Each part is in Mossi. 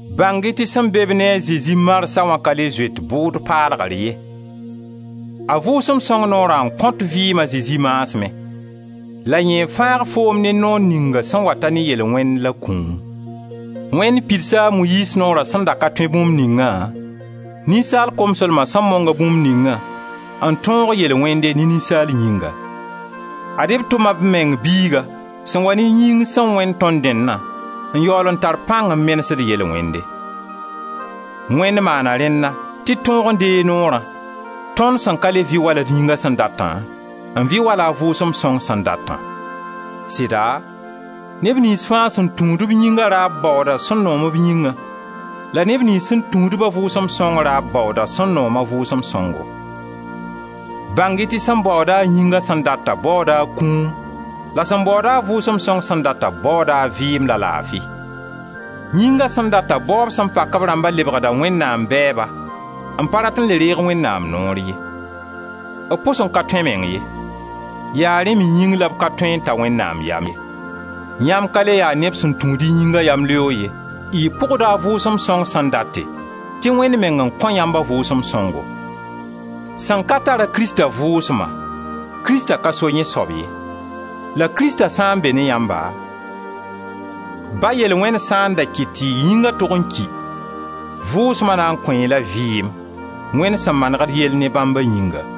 Bãng-y tɩ sẽn be-b ne a Zezi marsã wã ka le zoet bʋʋd paalgr ye. A Vʋʋsem Sõng noora n kõt vɩɩm a Zezi maasmẽ, la yẽ n fãag foom ne noor ninga sẽn wata ne yel-wẽnd la kũum. Wẽnd pidsa a Moyiiz Noora sẽn da ka tõe bũmb ningã, ninsaal komslma sẽn mong-a bũmb ningã, n tõog yel-wẽnde ne ninsaal yĩnga. Ad-y b tʋma b meng Biiga sẽn wa ne yĩng sẽn wẽnd tõnd dẽnna n yaool n tar pãng n menesd yel-wẽnde. Wẽnd maana rẽnna, tɩ d tõog n deeg Noorã, tõnd sẽn ka le vɩ wala d yĩnga sẽn datã, n vɩ wala a Vʋʋsem Sõng sẽn datã. Sɩda neb niyns fãa sẽn tũud-b yĩnga raab baooda sẽn noom b yĩngã la neb niyns sẽn tũud-ba a Vʋʋsem Sõng raab baooda sẽn noom a Vʋʋsem Sõngo. Bãng-y tɩ sẽn baood-a a yĩnga sẽn datã, baooda a kũum la sẽn baooda a Vʋʋsem Sõng sẽn datã, baooda a vɩɩm la laafi. Yĩnga sẽn data baoob sẽn pak b rãmbã, lebgda Wẽnnaam bɛɛba, n pa rat n le reeg Wẽnnaam noor ye; b pʋs n ka tõe meng ye. Yaa rẽ me yĩng la b ka tõe n ta Wẽnnaam yam ye. Yãmb ka le ya neb sẽn tũud b yĩnga yamleoog ye, y pʋgda a Vʋʋsem Sõngo sẽn date, tɩ Wẽnd meng kõ yãmb a Vʋʋsem Sõngo. Sẽn ka tar-a Krista Vʋʋsma, Krista ka so yẽ soab ye. La Krista sã n be ne yãmba, ba yel-wẽnd sã n da kɩt tɩ y yĩnga tog n ki, Vʋʋsma na n kõ-y-la vɩɩm, Wẽnd sẽn maneg d yell ne bãmba yĩnga.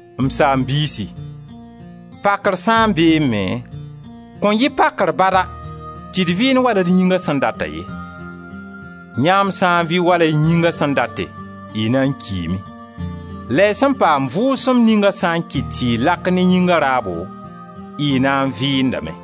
M saam-biisi, pakr sã n beẽ me, kõn yɩ pakr bada tɩ d vɩɩnd wala d yĩnga sẽn data ye. Yãmb sã n vɩ wala y yĩnga sẽn date, y na n kiime. La y sẽn paam Vʋʋsem ninga sã n kɩt tɩ y lak ne yĩnga raabo, y na n vɩɩndame.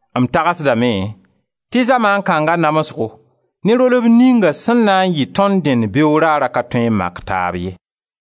M tagsdame tɩ zamaan kãnga namsgo ne rolb ninga sẽn na n yɩ tõnd dẽnd beoog raarã ka tõe n mak taab ye.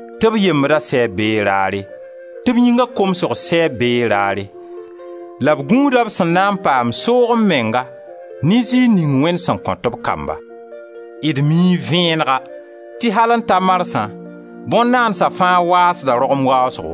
tɩ b yembdã sɛɛb bee raare, tɩ b yĩnga komsg sɛɛb bee raare, la b gũuda b sẽn na n paam soog-m-menga ne ziir ning Wẽnd sẽn kõt b kamba. D mii vẽenega tɩ al n ta marsã bõn-naandsa fãa waasda rogem waasgo;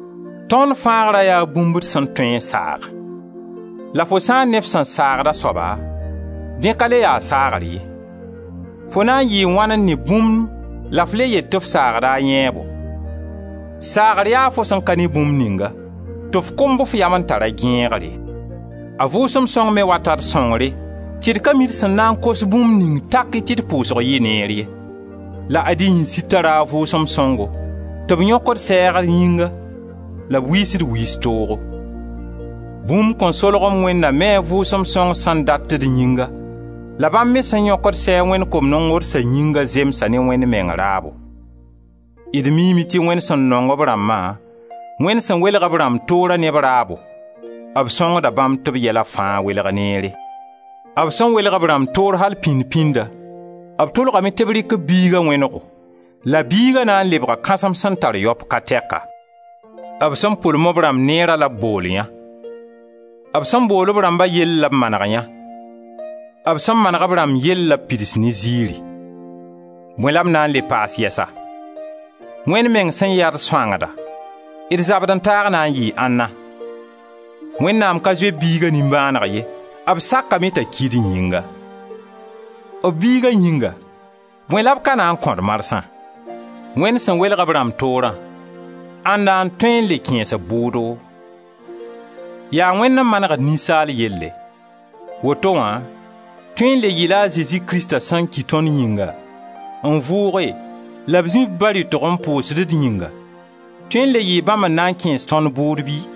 Tõnd fãagra yaa bũmb d sẽn tõe n saag. La fo sã n ne f sẽn saagda soaba, dẽ ka le ya saagr ye. Fo na n yɩɩ wãn n ne bũmb la f le yet tɩ f saagda a yãeebo? Saagr yaa fo sẽn ka ne bũmb ninga tɩ f kʋmb f yam n tar a gẽegre. A Vʋʋsem sõng me wata d sõngre, tɩ d ka mi d sẽn na n kos bũmb ning taki tɩ d pʋʋsg yɩ neer ye, la ad-y yĩnsir tara a Vʋʋsem Sõngo tɩ b yõkd sɛɛg d yĩnga la b wiisd wiis toogo. Bũmb-kõ-solg-m Wẽndã mi a Vʋʋsem Sõng sẽn dat d yĩnga la bãmb me sẽn yõkd sɛɛg Wẽnd kom-nongdsa yĩnga, zemsa ne Wẽnd meng raabo. D miime tɩ Wẽnd sẽn nong b rãmbã, Wẽnd sẽn welg b rãmb toorã ne b raabo, b sõngda bãmb tɩ b yɛla fãa welg neere. B sẽn welg b rãmb toor al pĩnd-pĩnda, b tʋlgame tɩ b rɩk b Biiga wẽnego la Biiga na n lebga kãsem sẽn tar yaop ka tɛka. B sẽn pʋlem b rãmb neera la b bool yã. B sẽn bool b rãmba yell la b maneg yã, b sẽn maneg b rãmb yell la b pids ne ziiri. Bõe la m na n le paas yɛsa? Wẽnd meng sẽn yaa d sõangdã d zabd-n-taag na n yɩɩ ãnna? Wẽnnaam ka zoe b Biiga nimbãaneg ye, b sakame t'a ki d yĩnga; b Biiga yĩnga, bõe la b ka na n kõ-d marsã? Wẽnd sẽn welg b rãmb toorã, ãnda n tõe n le kẽes-b bʋʋdo? Yaa Wẽnd n manegd ninsaal yelle. Woto wã tõe n le yɩ-la a Zezi Krista sẽn ki tõnd yĩnga, n vʋʋge la b zĩ b Ba rɩtg n pʋʋsd d yĩnga tõe n le yɩɩ bãmb n na n kẽes tõnd bʋʋd bɩ?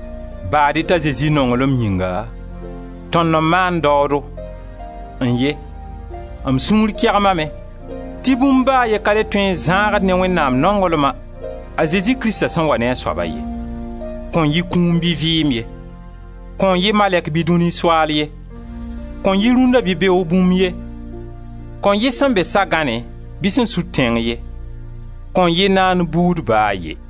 Baad-y t'a Zezi nonglem yĩnga, tõnd n maand daoodo. N-ye! M sũur kegmame tɩ bũmb ba a ye ka le tõe n zãag d ne Wẽnnaam nonglma, a Zezi Krista sẽn wa ne a soaba ye. Kõn yɩ kũum bɩ vɩɩm ye, kõn yɩ malɛk bɩ dũni soaal ye, kõn yɩ rũnna bɩ beoog bũmb ye, kõn yɩ sẽn be sa-gãnẽ bɩ sẽn sud tẽng ye, kõn yɩ naand buud ba a ye.